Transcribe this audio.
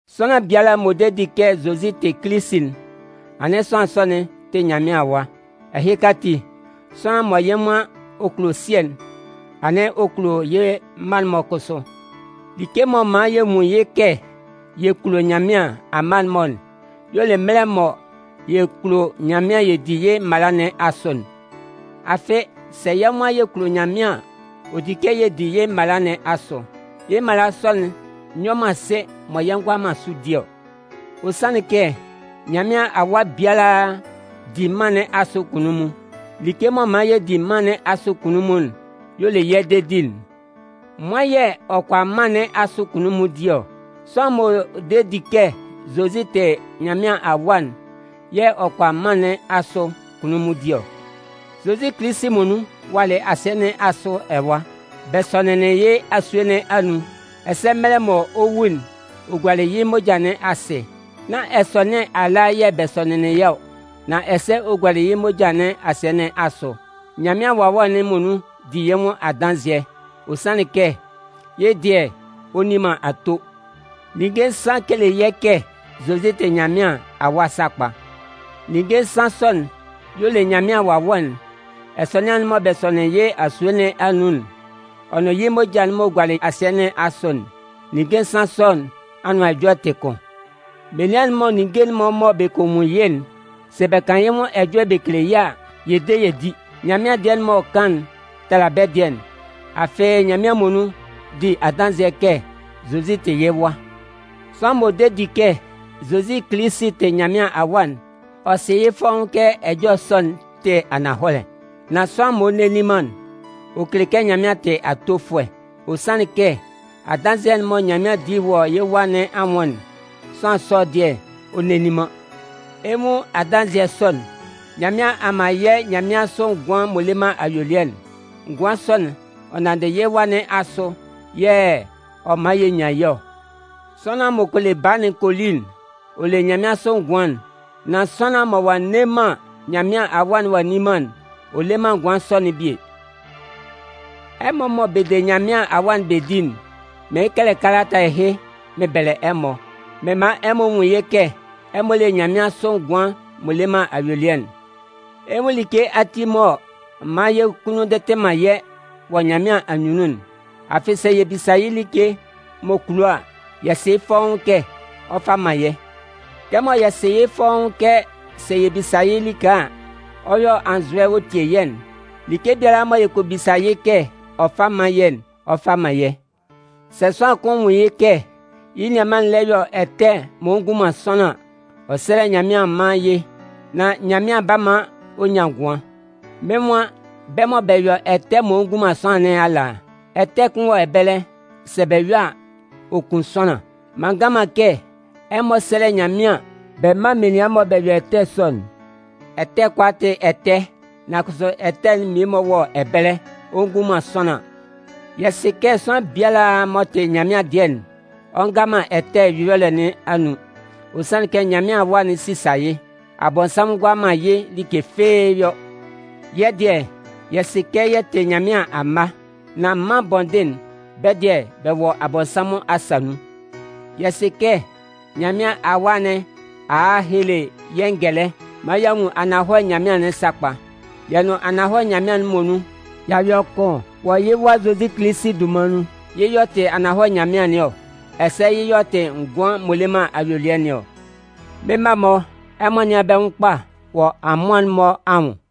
Sʋanlan biala m'ɔ de di kɛ Zozi tɩ Kilisi'n, anɩn sʋanlan sɔ'n tɩ Nyanmɩan awa. Ɛhɩka ati, sʋanlan mɔ yɩ́ nwan ɔ kulo Sɩɛ'n, anɩn ɔ kulo yɩ́ mma'n-mɔ kʋsʋ. Like m'ɔ man yɛ nwun yɩ́ kɛ yɛ kulo Nyanmɩan amma'n-mɔ'n y'ɔ le mɛlɛ mɔ yɛ kulo Nyanmɩan yɛ di yɩ́ mala nɩn asʋ'n. Afɩ, sɛ yɛ́ nwan yɛ kulo Nyanmɩan an, ɔ di kɛ yɛ di yɩ́ mala nɩn asʋ. Yɩ́ mala sɔ'n nyɔ man sɩ mɔ yɛ ngʋala man sʋ di ɔ. Ɔ sanlɩn kɛ Nyanmɩan awa biala di mân nɩn asʋ kunnunmun. Like m'ɔ man yɛ di mân nɩn asʋ kunnunmun'n y'ɔ le yɛ́ dedi'n. Nwan yɛ̂ ɔ kʋala mân nɩn asʋ kunnunmun di ɔ? Sʋanlan m'ɔ de di kɛ Zozi tɩ Nyanmɩan Awa'n yɛ̂ ɔ kʋala mân nɩn asʋ kunnunmun di ɔ. Zozi Kilisi muonun walɩ asɩɛ nɩn asʋ ɛwa. Bɛ sɔnɩnlɩn yɩ́ asue nɩn anun, ɛsɛ mɛlɛ mɔ ɔ 'wu'n, ɔ gualɩ yɩ́ moja nɩn asɩ. Nán ɛsɔnɩan ala yɛ̂ bɛ sɔnɩnlɩn yɩ́ ɔ, nan ɛsɛ ɔ gualɩ yɩ́ moja nɩn asɩɛ nɩn asʋ. Nyanmɩan Wawɛ'n muonun di yɩ́ nwʋn adanzɩɛ. Ɔ sanlɩn kɛ yɩ́ dɩɛ, ɔ nni man ato. Ninnge nsan kele yɛ́ kɛ Zozi tɩ Nyanmɩan Awa sakpa. Ninnge nsan sɔ'n y'ɔ le Nyanmɩan Wawɛ'n, ɛsɔnɩan'n mɔ bɛ sɔnɩnlɩn yɩ́ asue nɩn anun'n, ɔ nʋn yɩ́ moja'n m'ɔ gualɩ asɩɛ nɩn asʋ'n. Ninnge nsan sɔ nɩn anʋan ɛjɔlɛ tɩ kʋn. Menian'n-mɔ ninnge'n-mɔ mɔ bɛ kɔ nwun yɩ́'n, sɛ bɛ kan yɩ́ nwʋn ɛjɔlɛ bɛ kele yɛ́ a, yɛ de yɛ di. Nyanmɩan dɩɛ'n m'ɔ kan'n tala bɛ́ dɩɛ'n. Afɩ, Nyanmɩan muonun di adanzɩɛ kɛ Zozi tɩ yɩ́ Wa. Sʋanlan m'ɔ de di kɛ Zozi Kilisi tɩ Nyanmɩan Awa'n, ɔ sɩ yɩ́ fɔ́ʋ́n kɛ ɛjɔlɛ sɔ'n tɩ ananhɔlɛ. Nan sʋanlan m'ɔ nne nni man'n, ɔ kele kɛ Nyanmɩan tɩ atofʋɛ. Ɔ sanlɩn kɛ adanzɩɛ'n mɔ Nyanmɩan di wɔ yɩ́ Wa nɩn anwʋn'n, sʋanlan sɔ'n dɩɛ, ɔ nne nni man. Ɛ 'nwun adanzɩɛ sɔ'n: Nyanmɩan a man yɛ́ nyanmɩansʋ ngʋan'n m'ɔ le man ayuelɩɛ'n. Ngʋan sɔ'n, ɔ nanndɩ yɩ́ Wa nɩn asʋ yɛ̂ ɔ man yɛ nyan yɩ́ ɔ. Sʋanlan m'ɔ kɔ le Baa'n kɔ li'n, ɔ le nyanmɩansʋ ngʋan'n. Nan sʋanlan mɔ ɔ'a nne man Nyanmɩan Awa'n ɔ'a nni man'n, ɔ le man ngʋan sɔ'n bie. Ɛmɔ mɔ bɛ de Nyanmɩan Awa'n bɛ di'n, mɩɩn kɛlɛ kalata ɛhɩ mɩn bɛlɛ ɛmɔ, mɩn man ɛmɔ nwun yɩ́ kɛ ɛmɔ le nyanmɩansʋ ngʋan'n m'ɔ le man ayuelɩɛ'n. Ɛ 'nwun like ati m'ɔ man yɛ́ kunnun ndɩtɩ man yɛ́ wɔ Nyanmɩan anyunnun'n: afɩ sɛ yɛ bisa yɩ́ like m'ɔ kulo a, yɛ sɩ yɩ́ fɔ́ʋ́n kɛ ɔ 'fa man yɛ́. Kɛmɔ yɛ sɩ yɩ́ fɔ́ʋ́n kɛ sɛ yɛ bisa yɩ́ like a, ɔ yɔ anzʋɛ ɔ tie yɛ́'n, like biala mɔ yɛ kɔ bisa yɩ́ kɛ ɔ fá mán yɛ́'n, ɔ 'fa man yɛ́. Sɛ sʋanlan kʋn nwun yɩ́ kɛ yɩ́ nianman lɛ yɔ ɛtɛ m'ɔ ngun man sʋanlan an, ɔ sɛ́lɛ Nyanmɩan ɔ mán yɩ́, nán Nyanmɩan 'ba man ɔ nyan ngʋan. Mɩ́n nwan bɛ́ mɔ bɛ yɔ ɛtɛ m'ɔ ngun man sʋanlan nɩn ala. Ɛtɛ kʋn wɔ ɛbɛlɛ, sɛ bɛ yɔ a, ɔ kun sʋanlan. M'an ngan man kɛ ɛmɔ sɛ́lɛ Nyanmɩan bɛ mán menian mɔ bɛ yɔ ɛtɛ sɔ'n. Ɛtɛ kʋalaa tɩ ɛtɛ, nan kʋsʋ ɛtɛ'n mmie-mɔ wɔ ɛbɛlɛ, ɔ ngun man sʋanlan. Yɛ sɩ kɛ sʋanlan biala m'ɔ tɩ Nyanmɩan dɩɛ'n, ɔ nga man ɛtɛ ɛyɔlɛ nɩn anun. Ɔ sanlɩn kɛ Nyanmɩan Awa'n sisa yɩ́. Abɔnsanmʋn ngʋala man yɩ́ like fɩ́ɩ́ yɔ. Yɛ́ dɩɛ, yɛ sɩ kɛ yɛ tɩ Nyanmɩan amma, nan mân bɔndɩn'n, bɛ́ dɩɛ bɛ wɔ Abɔnsanmʋn asa nun. Yɛ sɩ kɛ Nyanmɩan Awa nɩn a a hele yɛ́ ngɛlɛ maan y'a nwun ananhɔlɛ Nyanmɩan'n sakpa. Yɛ nʋn ananhɔlɛ Nyanmɩan'n muonun, y'a yɔ kʋn wɔ yɩ́ Wa Zozi Kilisi dunman nun. Yɩ́ y'ɔ tɩ ananhɔlɛ Nyanmɩan nɩn ɔ, ɛsɛ yɩ́ y'ɔ tɩ ngʋan'n m'ɔ le man ayuelɩɛ nɩn ɔ. Mɩ́n mma-mɔ, ɛmɔ nɩ́an bɛ́ nwʋn kpa wɔ amʋan'n-mɔ anwʋn.